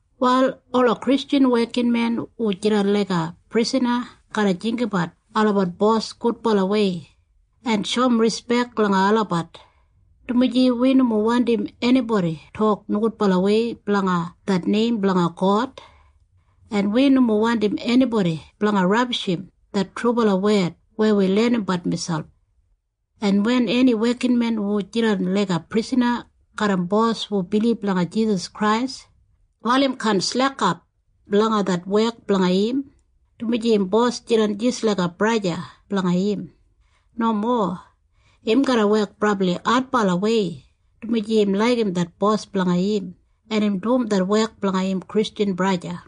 Wal ola Kristjan wekinmen hu jidan laiga prisana garra jinggabat olabat bos gudbalawei en shoum rispek langa olabat, dumaji wi nomo wandim enibodi tok nogudbalawei blanga det neim blanga God, en wi nomo wandim enibodi blanga rabishim det trubala wed weya wi lenimbat miselp. En wen eni wekinmen hu jidan laiga prisana garram bos hu bilib langa Jisas Krais, wal im kaan slekap langa det wek blanga im dumaji im bos jidan jis laiga braja o sista blanga im. Nomo. Im garra wek brabli adbalawei, dumaji im laigim det bos blanga im, en im dum det wek blanga im Kristjan braja.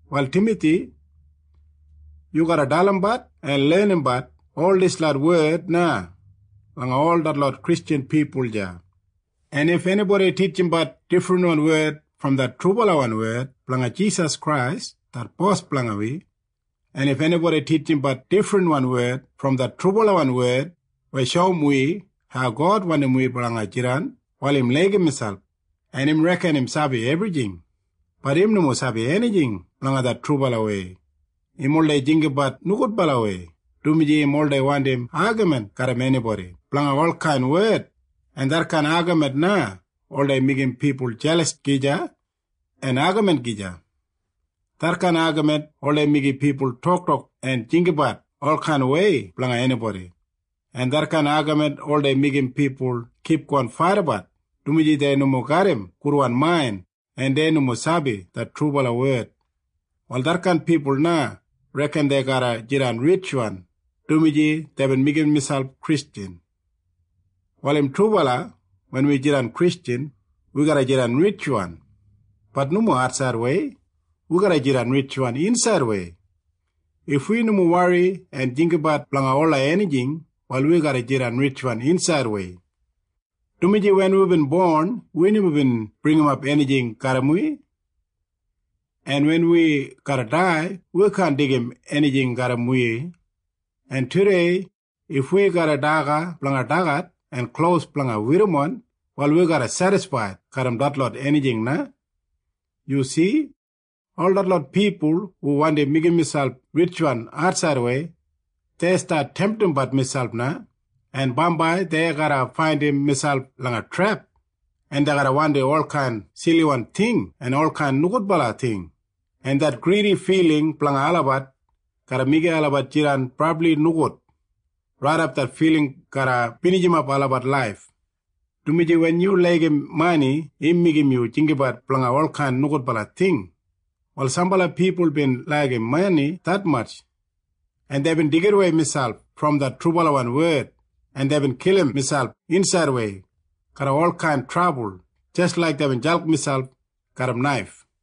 Wal Timathi, yu garra dalimbat en lenimbat ol dislot wed na langa ol detlot Kristjan pipul deya. En if enibodi titjimbat difrinwan wed brom det trubalawan wed blanga Jisas Krais det Bos blanga wi, en if enibodi titjimbat difrinwan wed brom det trubalawan wed weya shoum wi hau God wandim wi blanga jidan, wal im laigim miselp, en im reken im sabi ebrijing. Bat im nomo sabi enijing blanga det trubalawei. Im oldei jinggabat nogudbalawei, dumaji im oldei wandi agamin garram enibodi blanga olkain wed, en detkain agamin na oldei meigim pipul jelas gija en agamin gija. Detkain agamin oldei meigim pipul toktok en jinggabat olkainwei blanga enibodi, en detkain agamin oldei meigim pipul kipgon faidabat, dumaji dei nomo garram gudwan main en dei nomo sabi det trubala wed. Wal detkain pipul na reken dei garra jidan ritjwan dumaji deibin meigim miselp Kristjan. Wal im trubala wen wi jidan Kristjan, wi garra jidan ritjwan. Bat nomo atsaidwei. Wi garra jidan ritjwan insaidwei. If wi nomo wori en jinggabat blanga ola enijing, wal wi garra jidan ritjwan insaidwei, dumaji wen wibin bon, wi nomo bin bringimap enijing garram wi, en wen wi garra dai, wi kaan deigim enijing garram wi. En tudei if wi garram daga blanga dagat en klos blanga werrimon, wal wi garra sedisfaid garram detlot enijing na. Yu si? Ol detlot pipul hu wandi meigim miselp ritjwan atsaidwei, dei stat temtimbat miselp na, en bambai dei garra faindim miselp langa trep, en dei garra wandim olkain siliwan ting en olkain nogudbala ting, en det gridi filing blanga olabat garra meigim olabat jidan brabli nogud raidap det filing garra binijimap olabat laif, dumaji wen yu laigim mani, im meigim yu jinggabat blanga olkain nogudbala ting. Wal sambala pipul bin laigim mani detmatj, en deibin deigidawei miselp brom det trubalawan wed, en deibin kilim miselp insaidwei garram olkain trabul jis laik deibin jalk miselp garram naif.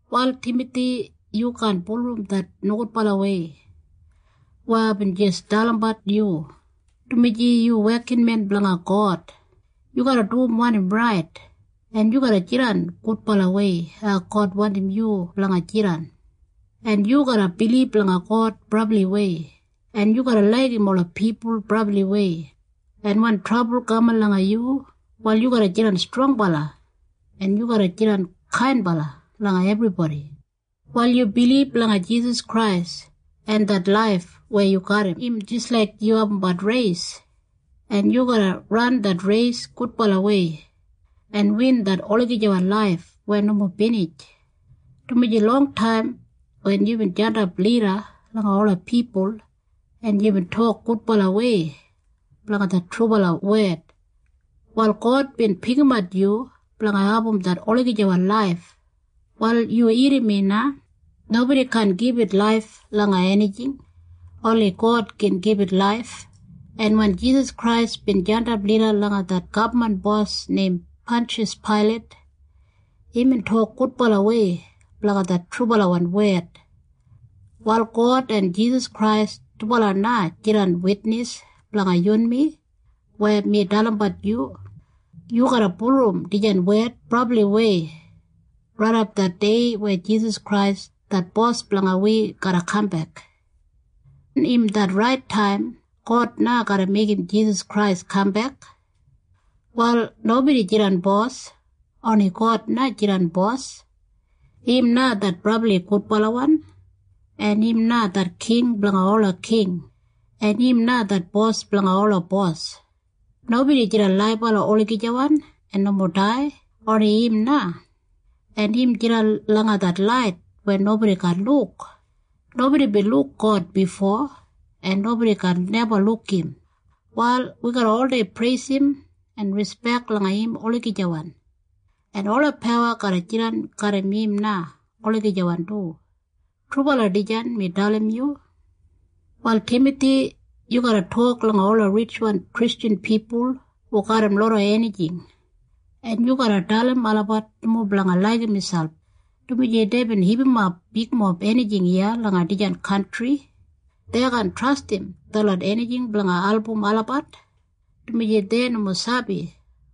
Wal Timathi, yu kaan bulurrum det nogudbalawei weya aibin jis dalimbat yu, dumaji yu wekinmen blanga God. Yu garra dum wanim rait, en yu garra jidan gudbalawei hau God wandim yu blanga jidan, en yu garra bilib langa God brabliwei, en yu garra laigim ola pipul brabliwei, en wen trabul kaman langa yu, wal yu garra jidan strongbala, en yu garra jidan kainbala langa ebribodi. Wal yu bilib langa Jisas Krais, en det laif weya yu garram im jis laik yu abumbat reis, en yu garra ran det reis gudbalawei en win det olagijawan laif weya nomo binij, dumaji longtaim wen yubin jandap lida langa ola pipul en yubin tok gudbalawei blanga det trubala wed, wal God bin pikimat yu blanga abum det olagijawan laif. Wal yu irrim mi na. Nobodi kaan gibit laif langa enijing. Oni God gin gibit laif. En wen Jisas Krais bin jandap lida langa det gabman bos neim Panshas Pailat, imbin tok gudbalawei blanga det trubalawan wed. Wal God en Jisas Krais dubala na jidan witnis blanga yunmi weya mi dalimbat yu. Yu garra bulurrum dijan wed brabliwei raidap det dei weya Jisas Krais det Bos blanga wi garra kambek. Wen im det rait taim, God na garra meigim Jisas Krais kambek. Wal nobodi jidan bos. Oni God na jidan Bos. Im na det brabli gudbalawan, en im na det King blanga ola king, en im na det Bos blanga ola bos. Nobodi jidan laibala olagijawan en nomo dai. Oni im na. En im jidan langa det lait weya nobodi kaan luk. Nobodi bin luk God bifo, en nobodi kaan neba luk im. Wal wi garra oldei preisim en rispek langa im olagijawan, en ola pawa garra jidan garram im na olagijawan du. Trubala dijan mi dalim yu. Wal Timathi, yu garra tok langa ola ritjwan Kristjan pipul hu garram loda enijing, en yu garra dalim olabat nomo blanga laigim miselp dumaji deibin hipimap bigmob enijing iya langa dijan kantri. Dei kaan trastim detlot enijing blanga album olabat, dumaji dei nomo sabi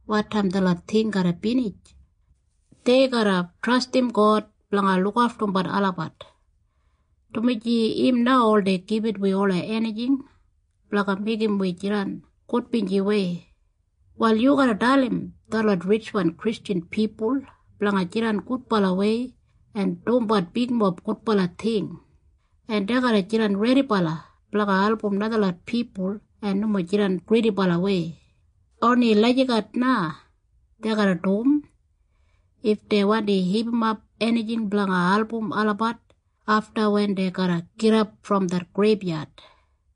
wotaim detlot ting garra binij. Dei garra trastim God blanga lukaftumbat olabat, dumaji im na oldei gibit wi ola enijing blanga meigim wi jidan gudbinjiwei. Wal yu garra dalim detlot ritjwan Kristjan pipul blanga jidan gudbalawei en dumbat bigmob gudbala ting, en dei garra jidan redibala blanga album najalot pipul en nomo jidan gridibalawei. Oni lagijat dei garra dum if dei wandi hipimap enijing blanga album olabat afta, wen dei garra gidap brom det greibyad.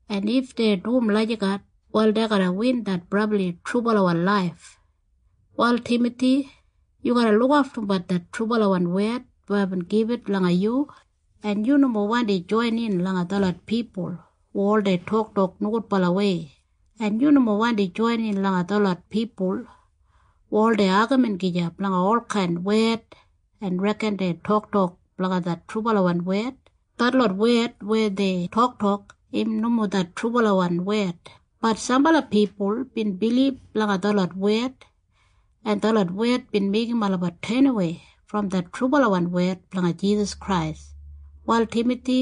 En if dei dum lagijat na dei garra win det brabli trubalawan laif. Wal Timathi, yu garra lukaftumbat det trubalawan wed weya aibin gibit langa yu, en yu nomo wandi joinin langa detlot pipul hu oldei toktok nogudbalawei, en yu nomo wandi joinin langa detlot pipul hu oldei agamin gija blanga olkain wed en reken dei toktok blanga det trubalawan wed. Detlot wed weya dei toktok, im nomo det trubalawan wed. Bat sambala pipul bin bilib langa detlot wed, en detlot wed bin meigim olabat tenawei brom det trubalawan wed blanga Jisas Krais. Wal Timathi,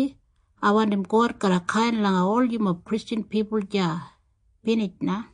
ai wandim God garra kain langa ol yumob Kristjan pipul deya. Binij na.